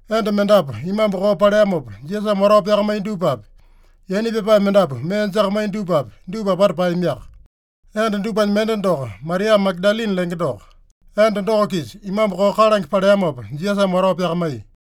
Enda mendapu imambu koo paleamopa Jisasame watao pyakamaiya dupapi, yaina pyapae mendapu mee jakamaiya dupapi, dupa apata paeyamiaka. Enda dupanya mende doko Maria Magadalini lenge doko. Enda doko-kisa imambu koo kalange paleamopa, Jisasame watao pyakamaiya.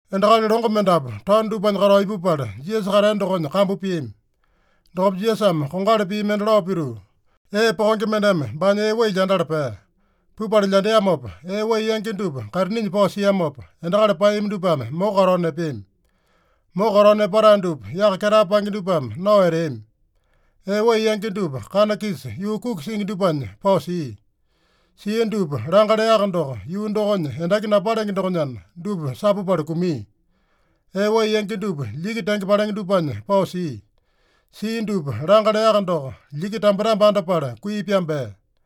Endakali longo mendapu taono dupanya katao ipupala, Jisasa katea dokonya kambu piami. Dokopa Jisasame kongali pii mende lao pituu, “Ee pokenge mendeme baanya ee wai lyandala pea. Pupala lyandeamopa, ee wai yangi dupa kaitininya pao siamopa, endakali paeyami dupame moko katao nepeami. Moko katao nepatae dupa yaka ketae paenge dupame nao eteami. Ee wai yangi dupa kana-kisa yuu kuki singi dupanya pao sia. Sia dupa langa leaka doko, yuu dokonya endaki napalenge dokonyana dupa sapupala kumia. Ee wai yangi dupa lyiki tenge palenge dupanya pao sia. Sia dupa langa leaka doko, lyiki tambetambe andapala kui pyambea.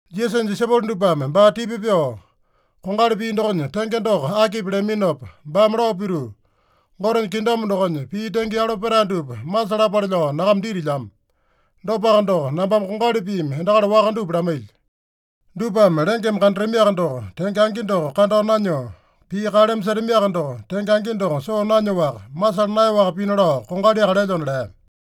Jisasanya disaipolo dupame baa tipa pyoo, “Kongali pii dokonya tenge doko akipi?” leaminopa, baame lao pituu, “Gotenya kingdom dokonya pii tenge yalo petae dupa masalapale lao nyakama ditilyamo. Dopaka doko, nambame kongali piimi endakali waka dupa lamailyo. Dupame lengeme kandatamiaka doko, tenge angi doko kandao nanyoo, pii kaleme setamiaka doko, tenge angi doko soo nanyoaka, masala naeyaowaka pina lao kongaliaka lelyona” lea.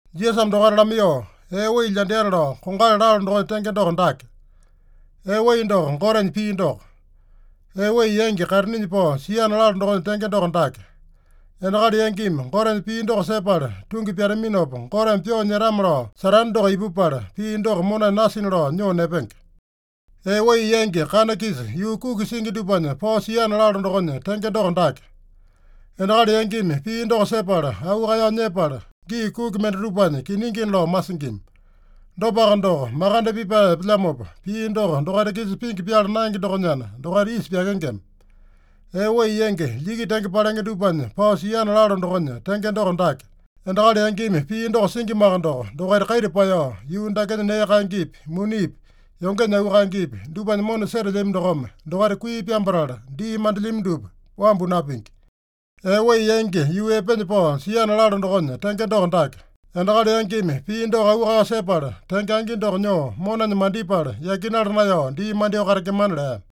Jisasame dokaita lamaiyoo, “Ee wai lyandeana lao kongali lalo dokonya tenge doko dake: Ee wai doko Gotenya pii doko. Ee wai yangi kaitininya pao siana lalo dokonya tenge doko dake: Endakali yangimi Gotenya pii doko sepala tungi pyataminopa, Goteme pyoo nyetame-lao Satane doko ipupala, pii doko monanya nasina lao nyoo nepenge. Ee wai yangi kana-kisa yuu kuki singi dupanya pao siana lalo dokonya tenge doko dake: Endakali yangimi pii doko sepala, auu kaeyao nyepala, gii kuki mendatupanya kiningina lao masingima. Dopaka doko, makande pipae epelyamopa, pii doko dokaita-kisa pingi pyala naenge dokonyana, dokaita isa pyakengema. Ee wai yangi lyiki tenge palenge dupanya pao siana lalo dokonya tenge doko dake: Endakali yangimi pii doko singimaka doko, dokaita kaita paeyao, yuu dakenya nee kaengepi, munipi, yongenya auu kaengepi dupanya mona setelyami dokome, dokaita kui pyambatala, dii mandelyami dupa wambu napingi. Ee wai yangi yuu epenya pao siana lalo dokonya tenge doko dake: Endakali yangimi pii doko auu kaeyao sepala, tenge angi doko nyoo monanya mandipala, yakinala naeyao dii mandyoo katengemana” lea.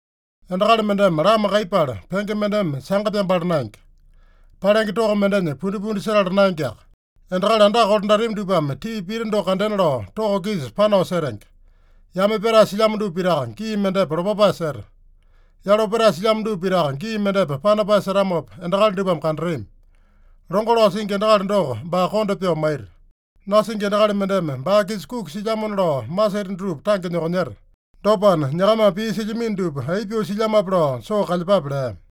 “Endakali mendeme lama kaiyepala, penge mendeme sanga pyambala naenge. Palenge toko mendenya pundipundi setala naengeaka. Endakali andaka kolandatami dupame tii pita doko kandena lao toko-kisa panao setenge. Yame pyatae silyamo dupa pitaka gii mendepa lopapae seta. Yalo petae silyamo dupa pitaka gii mendepa panapae setamopa, endakali dupame kandatami. Longo lao singi endakali doko, baa konda pyoo maita. Nasingi endakali mendeme baa-kisa kuki silyamona lao maseta dutupa tange nyokonyeta. Dopana, nyakamame pii silyamino dupa aipa pyoo silyamape lao soo kalyepape” lea.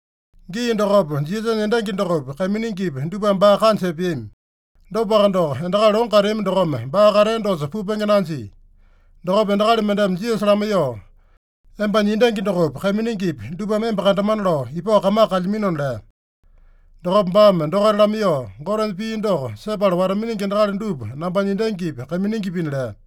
Gii dokopa Jisasanya endangi dokopi, kaiminingipi dupame baa kanja epeami. Dopaka doko, endakali longo kateami dokome, baa katea dosa pupenge nanjia. Dokopa endakali mendeme Jisasa lamaiyoo, “Embanya endangi dokopi, kaiminingipi dupame emba kandamana lao ipao kamaka kalyaminona” lea. Dokopa baame dokaita lamaiyoo, “Gotenya pii doko sepala wata-miningi endakali dupa nambanya endangipi, kaiminingipina” lea.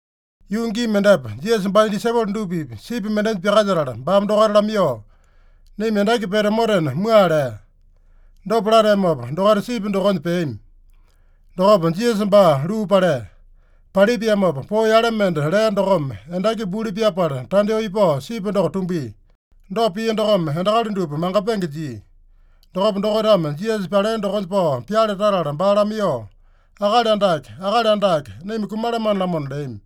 Yuu gii mendepa Jisasa baanya disaipolo dupa-pipa sipi mendenya pyakalyetala, baame dokaita lamaiyoo, “Naima endaki pete omotena mua” lea. Dopa lateamopa, dokaita sipi dokonya peami. Dokopa Jisasa baa luu palea. Palipiamopa poo yale mende lea dokome, endaki buli pyapala, tandyoo ipao sipi doko tumbia. Dopa pia dokome endakali dupa mangapenge jia. Dokopa dokaitame Jisasa palea dokonya pao pyale tatala baa lamaiyoo, “Akali Andake, Akali Andake, naima kumalamane-lamona” leami.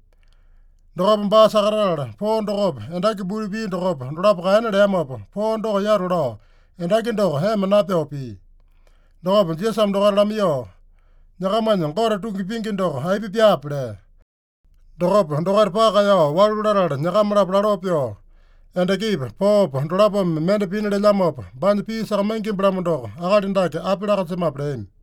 Dokopa baa sakatatala, poo dokopa, endaki buli pia dokopa, dolapo kaena leamopa, poo doko yatu lao, endaki doko ema napyoo pia. Dokopa Jisasame dokaita lamaiyoo, “Nyakamanya Gote tungi pingi doko aipa pyaape?” lea. Dokopa dokaita paka kaeyao walu latala, nyakama-lapo laloo pyoo, “Endakipa, poopa dolapome mende pina lelyamopa, baanya pii sakamaingimba-lamo doko, akali dake api laa-kanjemape?” leami.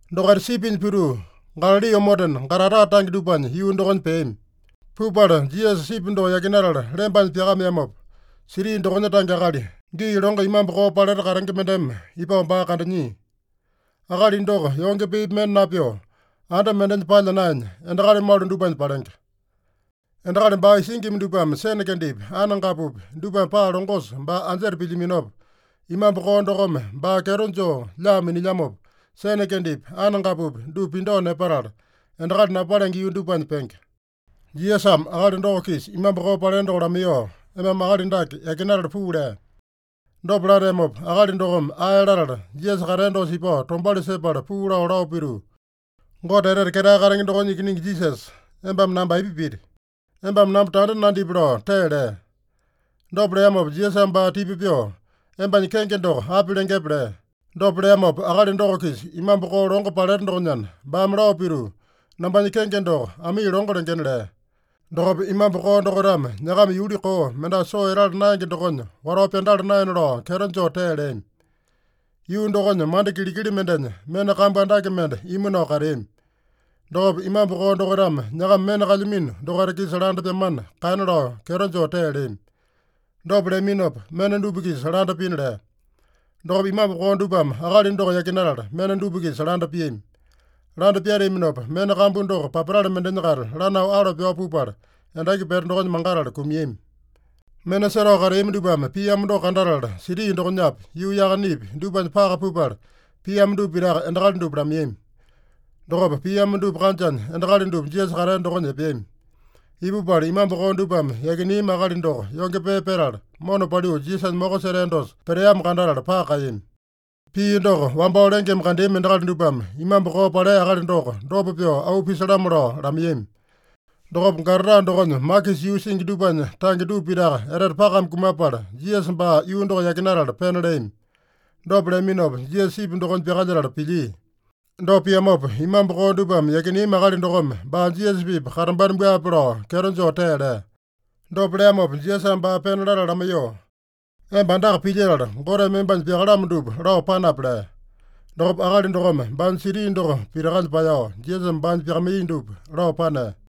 Dokaita sipinya pituu, Galali omotena, Gadara tange dupanya yuu dokonya peami. Pupala Jisasa sipi doko yakinatala lembanya pyakameamopa, siti dokonya tange akali, gii longo imambu koo paleta katenge mendeme ipao baa kandanyia. Akali doko yonge peepi mende napyoo, anda mendenya palya naenya, endakali malu dupanya palenge. Endakali baa isingima dupame sene kendepi, anengapupi dupame paa longosa baa anjeta pilyaminopa, imambu koo dokome baa kyeto joo lyaa minilyamopa, sene kendepi, anengapupi dupa pindao nepatala, endakali napalenge yuu dupanya penge. Jisasame akali doko-kisa imambu koo palea doko lamaiyoo, “Embame akali dake yakinatala puu” lea. Dopa lateamopa akali dokome ae latala, Jisasa katea dosa ipao tombauli sepala puu lao, lao pituu, “Gote Etete Ketae Katenge dokonya Ikiningi Jisasa, embame namba aipa piti? Embame namba tanda nandipi” lao tee lea. Dopa leamopa Jisasame baa tipa pyoo, “Embanya kenge doko api lengepe?” lea. Dopa leamopa akali doko-kisa imambu koo longo paleta dokonyana, baame lao pituu, “Nambanya kenge doko Amii Longo lengena” lea. Dokopa imambu koo dokaitame nyakama yuli koo, mendasa soo etala naenge dokonya watao pyandala naena lao kyeto joo tee leami. Yuu dokonya manda kilikili mendenya mena kambu andake mende imu nao kateami. Dokopa imambu koo dokaitame nyakama mena kalyamino dokaita-kisa landa pyamana kaena lao kyeto joo tee leami. Dopa leaminopa, mena dupa-kisa landa pina lea. Dokopa imambu koo dupame akali doko yakinatala, mena dupa-kisa landa piami. Landa pyateaminopa, mena kambu doko papatale mendenya-kaita lanao alo pyao pupala, endaki pete dokonya mangatala kumiami. Mena setao kateami dupame piamo doko kandatala, siti dokonyapi, yuu yakanepi, dupanya paka pupala, piamo dupa pitaka endakali dupa lamaiyami. Dokopa piamo dupa kanjanya endakali dupa Jisasa katea dokonya epeami. Ipupala imambu koo dupame yakineami akali doko yonge pee petala, mona paliu Jisasanya moko setea dosa peteamo kandatala paka kaeyami. Pia doko wambao lengeme kandeami endakali dupame imambu koo palea akali doko dopa pyoo auu pisalamo lao lamaiyami. Dokopa Gadara dokonya makisa yuu singi dupanya tange dupa pitaka etete pakame kumapala, Jisasa baa yuu doko yakinatala pena leami. Dopa leaminopa Jisasa sipi dokonya pyakalyetala pilyia. Dopa piamopa, imambu koo dupame yakineami akali dokome baa Jisasa-pipa katambana buape lao kyeto joo tee lea. Dopa leamopa Jisasame baa pena latala lamaiyoo, “Emba andaka pilyetala, Goteme embanya pyakalamo dupa lao panape” lea. Dokopa akali dokome baanya siti doko pitakanya paeyao, Jisasame baanya pyakamaiya dupa lao panea.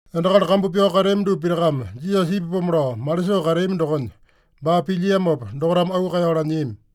Endakali kambu pyao kateami dupa pitakame Jisasa ipapomo lao malisoo kateami dokonya, baa pilyiamopa dokaitame auu kaeyao lanyiami.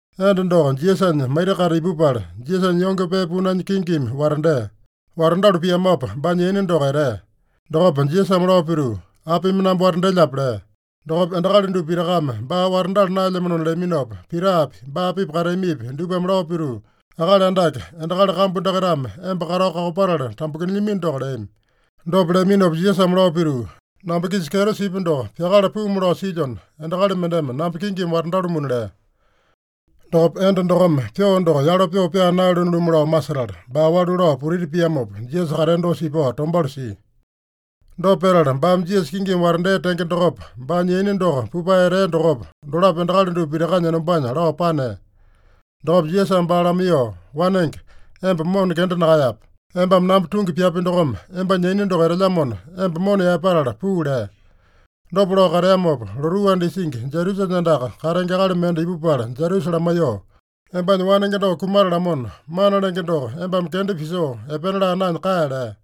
Enda doko Jisasanya maita-kaita ipupala, Jisasanya yonge pee punanya kingimi watandea. Watandalu piamopa baanya yaina doko etea. Dokopa Jisasame lao pituu, “Apimi namba watandelyape?” lea. Dokopa endakali dupa pitakame baa watandala naelyamanona leaminopa, Pitapi, baa-pipa kateamipi dupame lao pituu, “Akali Andake, endakali kambu dakaitame emba katao kakopatala tambukinilyamino doko” leami. Dopa leaminopa Jisasame lao pituu, “Namba-kisa kyeto sipya doko pyakala puumu lao silyona, endakali mendeme namba kingimi watandalumuna” lea. Dokopa enda dokome pyoo doko yalo pyoo pyaa naeyalone-lumu lao masetala, baa walu lao putiti piamopa, Jisasa katea dosa ipao tombauli sia. Dopa petala baame Jisasa kingimi watandea tenge dokopa, baanya yaina doko pupae etea dokopa, dolapo endakali dupa pitakanya enombanya lao panea. Dokopa Jisasame baa lamaiyoo, “Wanenge, emba mona kenda nakaeyape. Embame namba tungi pyapi dokome, embanya yaina doko etelyamona, emba mona yaepatala puu” lea. Dopa lao kateamopa, lotuu anda isingi Jairusanya andaka katenge akali mende ipupala Jairusa lamaiyoo, “Embanya wanenge doko kumatalamona, Mana Lenge doko embame kenda pisoo epena laa naenya kae” lea.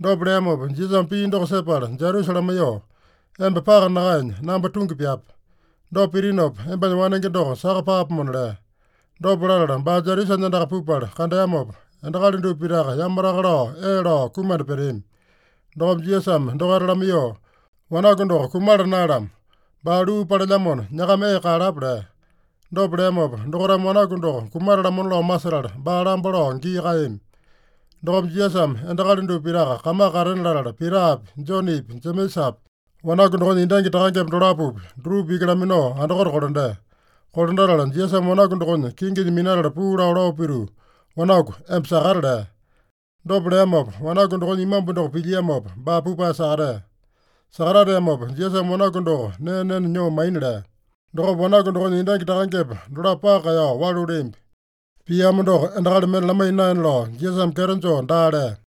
Dopa leamopa Jisasame pii doko sepala Jairusa lamaiyoo, “Emba paka nakaenya, namba tungi pyape. Dopa pitinopa embanya wanenge doko saka paapomona” lea. Dopa latala, baa Jairusanya andaka pupala kandeamopa, endakali dupa pitaka yamataka lao ee lao kumanda peteami. Dokopa Jisasame dokaita lamaiyoo, “Wanaku doko kumala naeyalamo. Baa luu palelyamona, nyakama ee kaeyalapa” lea. Dopa leamopa, dokaitame wanaku doko kumatalamona lao masetala, baa lamba lao gii kaeyami. Dokopa Jisasame endakali dupa pitaka kamaka katena latala, Pitapi, Jonepi, Jemesapi, wanaku dokonya endangi takangepa dolapopi, dutupa iki laminao andakote kolandea. Kolandatala Jisasame wanaku dokonya kinginya minatala puu lao, lao pituu, “Wanaku, emba sakata” lea. Dopa leamopa, wanaku dokonya imambu doko pilyiamopa, baa pupae sakatea. Sakatateamopa Jisasame wanaku doko nee nena nyoo maina lea. Dokopa wanaku dokonya endangi takangepa dolapo paka kaeyao walu leambi. Piamo doko endakali mende lamaiya naena lao Jisasame kyeto joo daa lea.